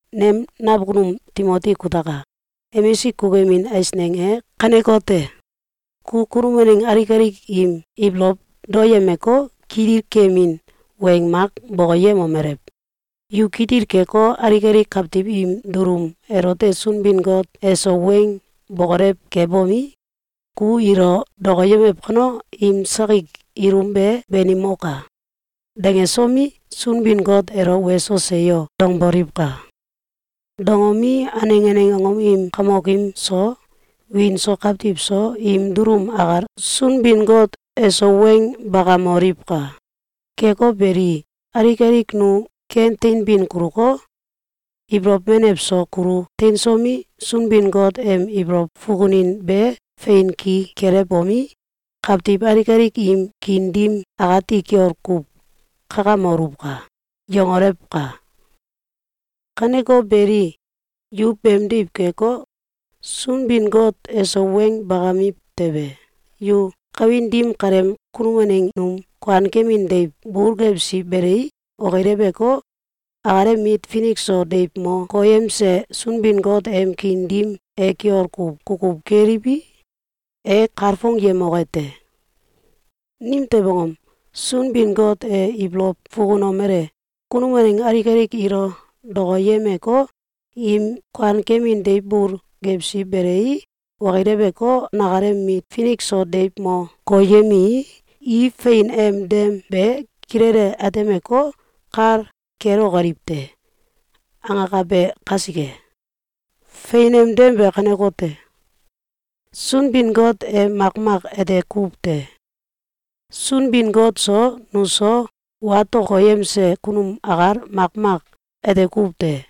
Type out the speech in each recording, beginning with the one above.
Nem nakunum Timoti kutaka! Emisik kukuyemin eisneng e kanekote: Ku kunum waneng alik alik im ibolow daoyemeko, kitil keyemin weng mak bokoyemomelew: “Yu kitil keko, alik alik kawtiw im dulum elote Sunbin-Got eso weng bokolew kebomi, ‘Ku ilo dokoyemew kano, im sakik ilum be banimoka!’, dangesomi, Sunbin-Got elo ‘Weso! Seyo!’, dangboliwka! Dangomi, aneng aneng angom im kamokim so, wiin so kawtiw so, im dulum akal Sunbin-Got eso weng bakamoliwka! Keko beli, alik alik nu ken teinbin kuluko, ibolow menew so kulu teinsomi, Sunbin-Got em ibolow fukunin be fein ki kelewbomi, kawtiw alik alik im kiin dim akati kiol kuw kakamoluwka!”, yangolewka! Kaneko beli, yu beemdiw keko, Sunbin-Got eso weng bakamiw tewe, yu kawin dim kaleem kunum waneng num kuankemin deiw bul gewsi belei, okileweko, akalem mit finik so deiw mo koyemse Sunbin-Got em kiin dim e kiol kuw kukuw keliwi, e kalfongyemoke te. Nimtew angom? Sunbin-Got e ibolow fukunomele: “Kunum waneng alik alik ilo dokoyemeko, im kuankemin deiw bul gewsi belei, okileweko, nakalem mit finik so deiw mo koyemii, i fein em dem be kilele atemeko, kal kelokoliw te!”, angakabe kasike. Fein em dem be kanekote: Sunbin-Got e makmak ete kuw te. Sunbin-Got so, nuso, watokoyemse kunum akal makmak ete kuw te.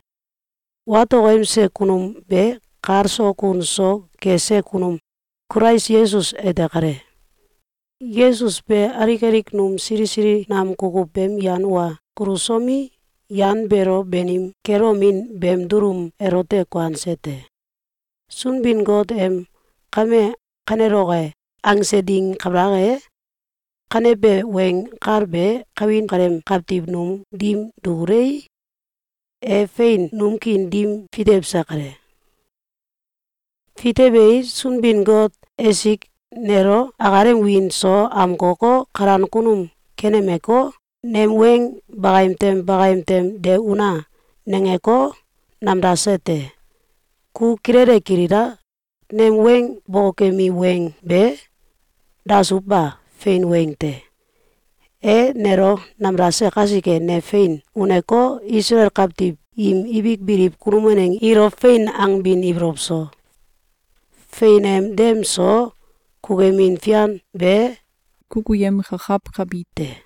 Watokoyemse kunum be kal so kun so kese kunum Kulais Yesus ete kale. Yesus be alik alik num sili sili nam kukuw beem yan wa kulusomi, yan beelo banim kelomin beem dulum elote kuanse te. Sunbin-Got em “Kame kaneloke!”, angse ding kabalak e, kanebe weng kal be kawin kaleem kawtiw num dim dukulei, e fein num kiin dim fitewse kale. Fitewei, Sunbin-Got esik nelo akalem wiin so amkoko, kalan kunum kenemeko, “Nem weng bakayem tem bakayem tem de una!”, nangeko, namdase te. Ku kilele kilila! Nem weng bokokemi weng be dasuw ba, fein weng te! E nelo namdase kasike, ne fein uneko, Isalael kawtiw im ibik biliw kunum waneng ilo fein angbin ibolow so, fein em dem so, kukuyemin fian be kukuyemkakawkabi te.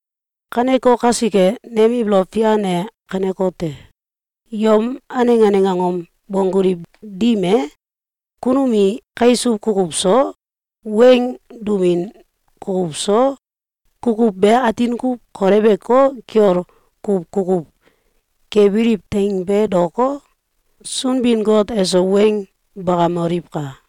Kaneko kasike, nem ibolow fian e kanekote: Yom aneng aneng angom bongguliw dim e, kunum i kaisuw kukuw so, weng dumin kukuw so, kukuw be atin kuw koleweko, kiol kuw kukuw kebiliw teing be daoko, Sunbin-Got eso weng bakamoliwka!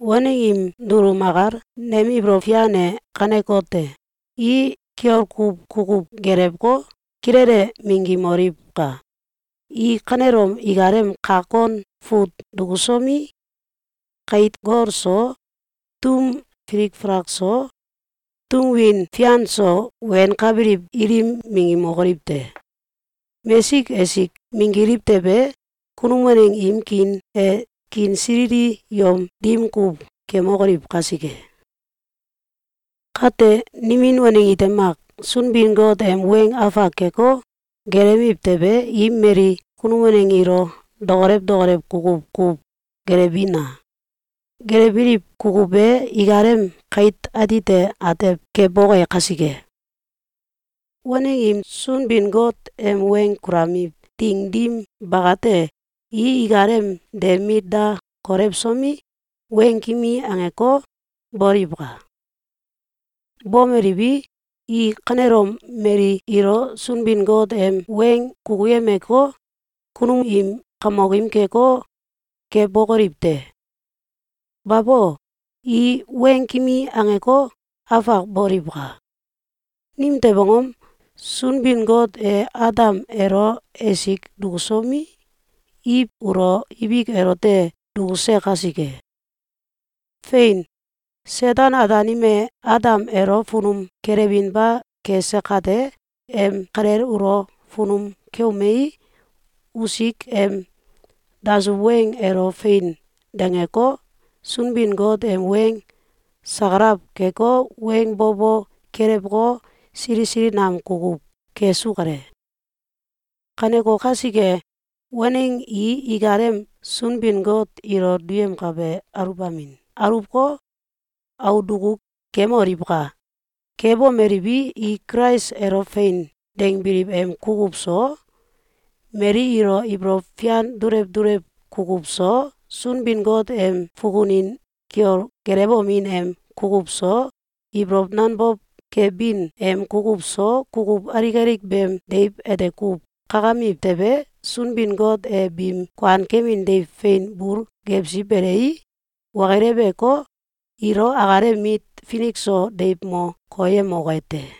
Waneng im dulum akal nem ibolow fian e kanekote: I kiol kuw kukuw gelewko, kilele minggimoliwka! I kanelom ikalem kak kon fut dukusomi, kait gol so, tum filik falak so, tum win fian so wenkabiliw ilim minggimokoliw te! Mesik esik minggiliw tewe, kunum waneng im kiin e kiinsilili yom dim kuw kemokoliw kasike. Kate, nimin waneng ite mak Sunbin-Got em weng afak keko, gelewiw tewe, i mali kunum waneng ilo dokolew dokolew kukuw kuw gelewbina! Gelewbiliw kukuw be ikalem kait atite atew keboke kasike. Waneng im Sunbin-Got em weng kulamiw ding dim bakate, i ikalem de mit da kolewsomi, weng kimi angeko, boliwka! Bomeliwi, i kanelom mali ilo Sunbin-Got em weng kukuyemeko, kunum im kamokim keko, kebokoliw te! Babo! I weng kimi angeko, afak boliwka! Nimtew angom? Sunbin-Got e Adam elo esik dukusomi, Iw ulo ibik elote dukuse kasike. Fein! Seten-Ataanim e Adam elo funum kelewinba kese kate, em kalel ulo funum keumei, usik em dasuw weng elo “Fein!”, dangeko, Sunbin-Got em weng sakalaw keko, weng bo bo kelewko, sili sili nam kukuw kesu kale. Kaneko kasike, waneng i ikalem Sunbin-Got ilo duyemkabe aluwbamin aluwko, aul duku kemoliwka! Kebomeliwi, i Kulais elo “Fein!”, dangbiliw em kukuw so, mali ilo ibolow fian dulew dulew kukuw so, Sunbin-Got em fukunin kiol gelewomin em kukuw so, ibolow nanbow kebin em kukuw so, kukuw alik alik beem deiw ete kuw kakamiw tewe, Sunbin-Got e biim kuankemin deiw fein bul gewsi belei, okileweko, ilo akalem mit finik so deiw mo koyemoke te.